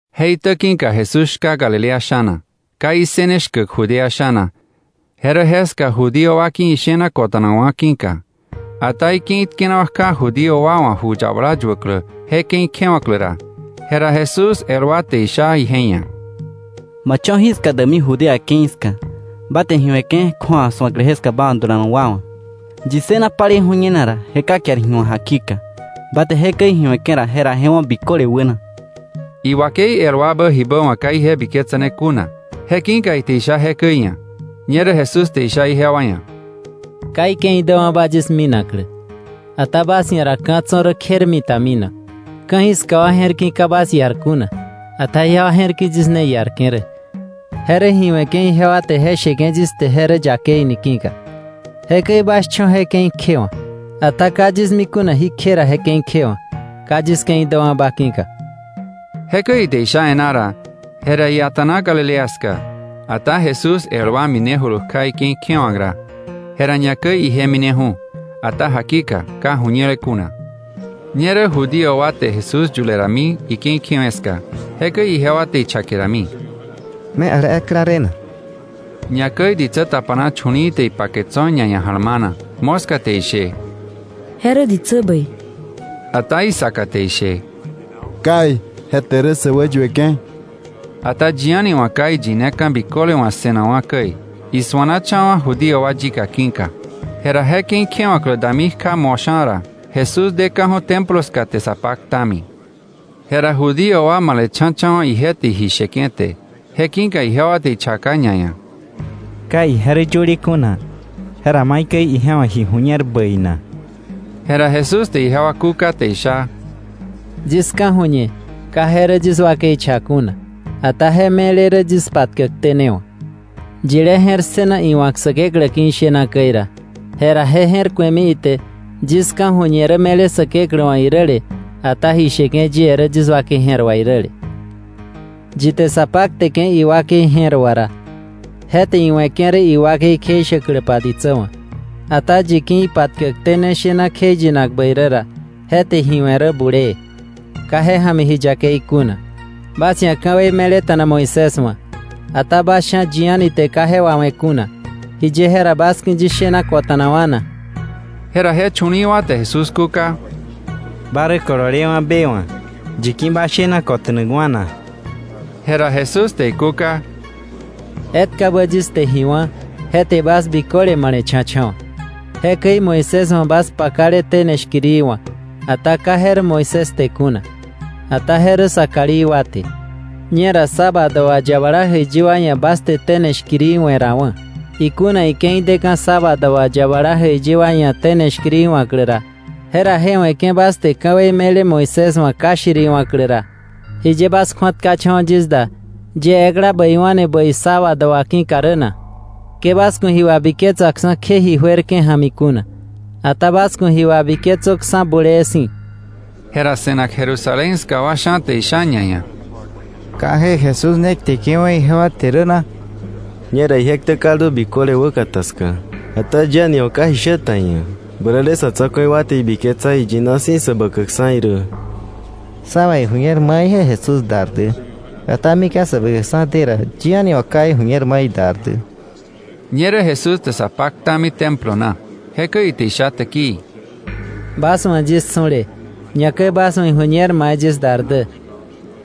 Je itä ki̱ka Jesús shka Galilea sha̱na. Ka issëne shkäk Judea sha̱na, je rä jeska Judío wa ki̱ ishena kota̱nakwa̱ ki̱ka. Ata ike̱i tkenawa̱ kja Judío wa wa̱ Ju Yabala Yuäklä je ke̱i kjewa̱klä ra, jera Jesús el wa te isha ije ia̱: —Ma cho̱ jiska däkmi Judea ke̱i ska, ba te ji we̱ke̱ kju̱awa su̱aklä jeska ba wa̱ dulanak wa wa̱. Yi ssëna palei ju̱ñenak ra, je ka kiar ji wa̱k jakika. Ba te jekäi ji we̱ke̱ ra, jera je wo̱ biköle wäna. Iwakei el wabä jibä wa̱ ka ije biketsane kuna, je ki̱ka ite isha jekäi iia̱. Ñerä Jesús te isha ijewa ia̱: —Ka ike̱i däwa̱ba yis minaklä, ata bas ia̱ ra ka̱ tso̱ rä kjermita minak. Ka̱jiska wa je̱r ki̱ ka bas iar kuna, ata jewa je̱r ki̱ yis ne iarke̱ rä, je rä ji we̱ke̱ ijewa te je sheke̱ yis te je rä yakei ni ki̱ka. Jekäi bas cho̱ je ke̱i kjewa̱k. Ata ka yis mi kuna jí kje ra je ke̱i kjewa̱k, ka yis ke̱i däwa̱ba ki̱ka. Jekäi ite isha e̱ná ra, jera ia̱ta̱na Galilea ska. Ata Jesús el wa minejulu kja ike̱i kjewa̱k ra, jera ñakäi ije mineju̱, ata jakika, ka ju̱ñele kuna. Ñerä Judío wa te Jesús yule dami ike̱i kjewe̱ ska. Jekäi jewa te ichake rami: —¿Me ale ekla de na? Ñakäi ditsä tapana chu̱li̱i̱ te ipake tso̱ ñaia̱ ja̱lmana. Moska te ishe: “Je rä ditsä bäi”; ata isaka te ishe: “Kai, je te rä sä wäyueke̱.” Ata yi a̱ni wa̱ ka iyineka̱ biköle wa̱ ssënakwa̱ käi, isuanacha̱wa̱ Judío wa yika ki̱ka. Jera je ke̱i kjewa̱klä dami kja mosha̱ ra, Jesús deka̱ju̱ Templo ska te sa paktami. Jera Judío wa male̱cha̱cha̱wa̱ ije te ji sheke̱ te. Je ki̱ka ijewa te ichaka ñaia̱: —Ka ije rä yöle kuna. ¿Jera maikäi ije wa̱ ji ju̱ñer bäi na? Jera Jesús te ijewa kúka te isha: —Yis ka̱ju̱ñe ka je rä yis wakei cha kuna, ata je me̱le rä yis patkäkté ne wa̱. Yilé je̱r ssëna iwa̱k Säkeklä ki̱ ishena käi ra, jera je je̱r ku̱emi ite yis ka̱ju̱ñe rä me̱le Säkeklä wa̱ iräle, ata ji sheke̱ yie rä yis wakei je̱r wà iräle. Yi te sa pakteke̱ iwakei je̱r wà ra, je te iwe̱ke̱ rä iwakei kjeishäkläpa ditsä wa̱. Ata yi ki̱ ipatkäkté ne shena kjeiyinak bäi rä ra, je te ji we̱ rä bulee. Ka je ja̱mi ji yakei kuna. “Bas ia̱ ka̱wei me̱leta̱na Moisés wa̱, ata bas sha̱ yi a̱ni te ka je wawe̱ kuna. ¿Jiye jera bas ki̱ yis shena kota̱nakwa̱ na?” Jera je chu̱li̱i̱ wa te Jesús kúka: —Ba rä kololewa̱ be wa̱. ¿Yi ki̱ ba shena kota̱nakwa̱ na? Jera Jesús te ikúka: —Etkabä yis te ji wá̱, je te bas biköle male̱cha̱cha̱wa̱. Jekäi Moisés wa̱ bas pakale tene shkiri wa̱k, ata ka je rä Moisés te kuna, ata je rä sa kalí wa te. Ñera sábado wà yabala jäiyi wa ia̱ bas te tene shkiri we̱ rawa̱. Ikuna ike̱i deka̱ sábado wà yabala jäiyi wa ia̱ tene shkiri wa̱klä, jera je we̱ke̱ bas te ka̱wei me̱le Moisés wa̱ ka shiriwa̱klä ra, ¿jiye bas kju̱atkacha̱wa̱ yis da, yie ekla bäiwa̱ni bäi sábado wà ki̱ka rä na? Ke bas ku̱ ji wabiketsaksa̱ kje ji juerke̱ ja̱mi kuna, ata bas ku̱ ji wabiketsöksa̱ bulee si̱. Jera se̱nak Jerusalén ska wa sha̱ te isha ñaia̱: —¿Ka je Jesús ne kteke̱wa̱ ijewa te rä na? Ñera je ktä kaldu biköle wäkata ska, ata yi a̱ni wa̱ ka ji shä ta iia̱. Bäräle sa̱ tsa̱ku̱i wa te ibiketsa iyina si̱ Säbäkäkksa̱ irä. Sa̱ wa̱ iju̱ñer mai je Jesús dar dä, ata mika̱ Säbäkäkksa̱ de ra, yi a̱ni wa̱ ka iju̱ñer mai idar dä. Ñerä Jesús te sa paktami Templo na. Jekäi ite isha täkii: —Bas wa̱ yis su̱le, ñakäi bas wa̱ iju̱ñer mai yis dar dä.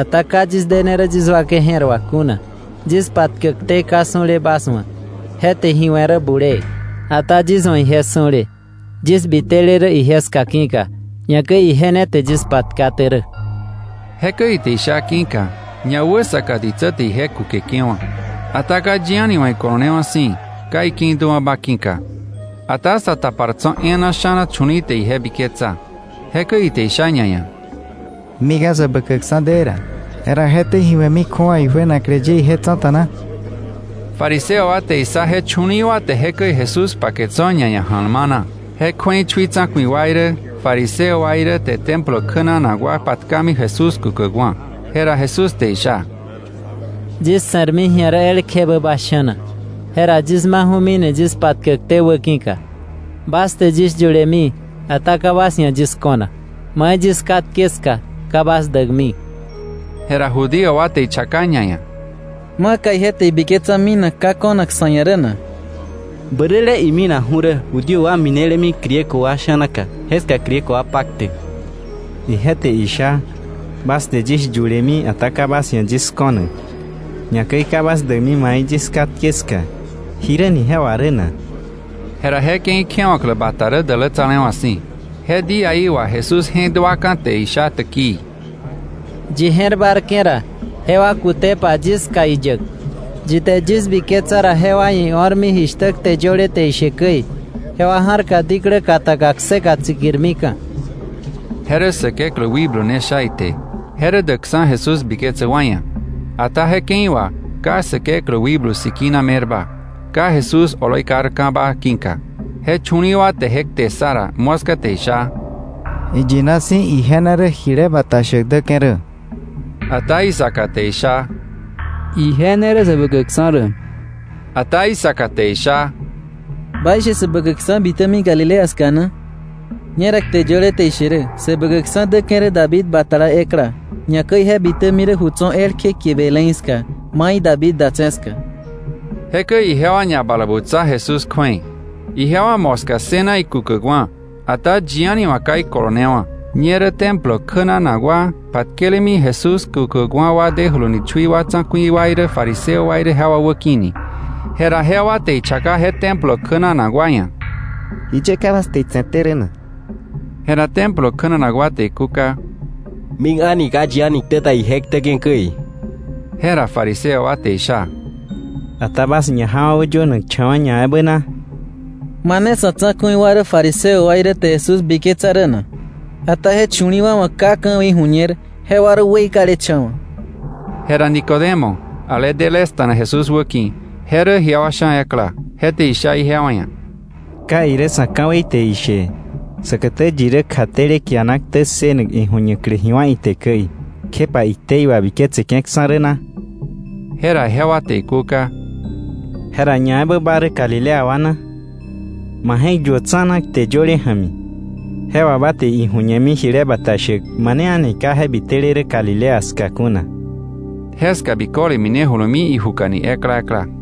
Ata ka yis dene rä yis wakei je̱r wà kuna. Yis patkäkté ka su̱le bas wa̱, je te ji we̱ rä bulee. Ata yis wa̱ ije su̱le, yis bitele rä ije ska ki̱ka, ñakäi ije ne te yis patkaté rä. Jekäi ite isha ki̱ka, ñawäsaka ditsä te ije kukeke̱wa̱. Ata ka yi a̱ni wa̱ ikolonewa̱ si̱, ka ike̱i däwa̱ba ki̱ka. Ata sa tapar tso̱ e̱e̱na sha̱na chu̱li̱i̱ te ije biketsa. Jekäi ite isha ñaia̱: —Mika̱ Säbäkäkksa̱ de ra, jera ¿je te ji we̱mi kju̱awa ijuenaklä ye ije tsa̱ta na? Fariseo wa te issa je chu̱li̱i̱ wa te jekäi Jesús pake tso̱ ñaia̱ ja̱lmana. Je kju̱ei chui tsa̱ku̱i wa irä, fariseo wa irä te Templo kjänanak wa patkami Jesús kukäkwa̱. Jera Jesús te isha: —Yis se̱rmi ji̱a rä elkjebä bas sha̱na, jera yis maju̱mini yis patkäkté wä ki̱ka. Bas te yis yulemi, ata ka bas ia̱ yis ko̱nak. Mai yis katke ska, ka bas däkmi. Jera Judío wa te ichaka ñaia̱: —¿Maka ije te ibiketsa minak ka ko̱nak sa̱ ia̱ rä na? Bäräle iminaju̱ rä Judío wa minelemi Griego wa sha̱naka, jeska Griego wa paktäk. Ije te isha: ‘Bas te yis yulemi, ata ka bas ia̱ yis ko̱nak, ñakäi ka bas däkmi mai yis katke ska.’ ¿Jiräni je wà rä na? Jera je ke̱i kjewa̱klä bata rä dälätsalewa̱ si̱. Je díaí wà Jesús je̱k duaka̱ te isha täkii: —Yi je̱r bárke̱ ra, jewa kutepa yis ska iyäk. Yi te yis biketsa ra jewa ia̱ io̱rmi jishtä kte yöle te ishe käi, jewa ja̱rka diklä kataka kseka tsikirmika̱. Je rä Säkeklä Wikblu ne sha ite. Je rä däkksa̱ Jesús biketsäk wa ia̱. Ata je ke̱i wà ka Säkeklä Wikblu Sikina me̱rba, ka Jesús oloi karka̱ba ki̱ka. Je chu̱li̱i̱ wa te je kte ssa ra, moska te isha: —Iyina si̱ ije ne rä jile bata shäk däke̱ rä. Ata isaka te isha: —Ije ne rä Säbäkäkksa̱ rä. Ata isaka te isha: —¿Baishe Säbäkäkksa̱ bitämi Galilea ska na? Ñera kte yöle te ishe rä Säbäkäkksa̱ däke̱ rä David batala ekla, ñakäi je bitämi rä ju tso̱ elkje kie Belén ska, mai David datse̱ ska. Jekäi ijewa ñabalabutsa Jesús kju̱ei. Ijewa moska ssëna ikukäkwa̱, ata yi a̱ni wa̱ ka ikolonewa̱. Ñerä Templo kjänanak wa patkelemi Jesús kukäkwa̱ wa dejuluni chui tsa̱ku̱i wa irä fariseo wa irä jewa wäki̱ni. Jera jewa te ichaka je Templo kjänanak wa ia̱: —¿Jiye ka bas te itse̱te rä na? Jera Templo kjänanak wa te ikúka: —Mik a̱ni ka yi a̱ni ktä ta ije ktäke̱ käi. Jera fariseo wa te isha: —¿Bas wakwa ñajawa̱ wäyönakcha̱wa̱ ñaebä na? ¿Mane sa̱ tsa̱ku̱i wa irä fariseo wa irä te Jesús biketsa rä na? Ata je chu̱li̱i̱ wa wa̱ ka ka̱wei ju̱ñer, jewa rä weikalecha̱wa̱. Jera Nicodemo, ale delesta̱na Jesús wäki̱, je rä ijewa sha̱ ekla, je te isha ijewa ia̱: —¿Ka irä sa̱ ka̱wei te ishe, säkätä yi rä kjatele kiana ktä ssënak iju̱ñaklä ji wá̱ ite käi, kjepa iktei wabiketseke̱ksa̱ rä na? Jera jewa te ikúka: —¿Jera ñaebä ba rä Galilea wa na? Ma je̱k yuö tsa̱na kte yöle ja̱mi. Je wà ba te iju̱ñemi jile bata shäk mane a̱ni ka je bitele Galilea ska kuna. Jeska biköle minejulumi ijukani ekla ekla.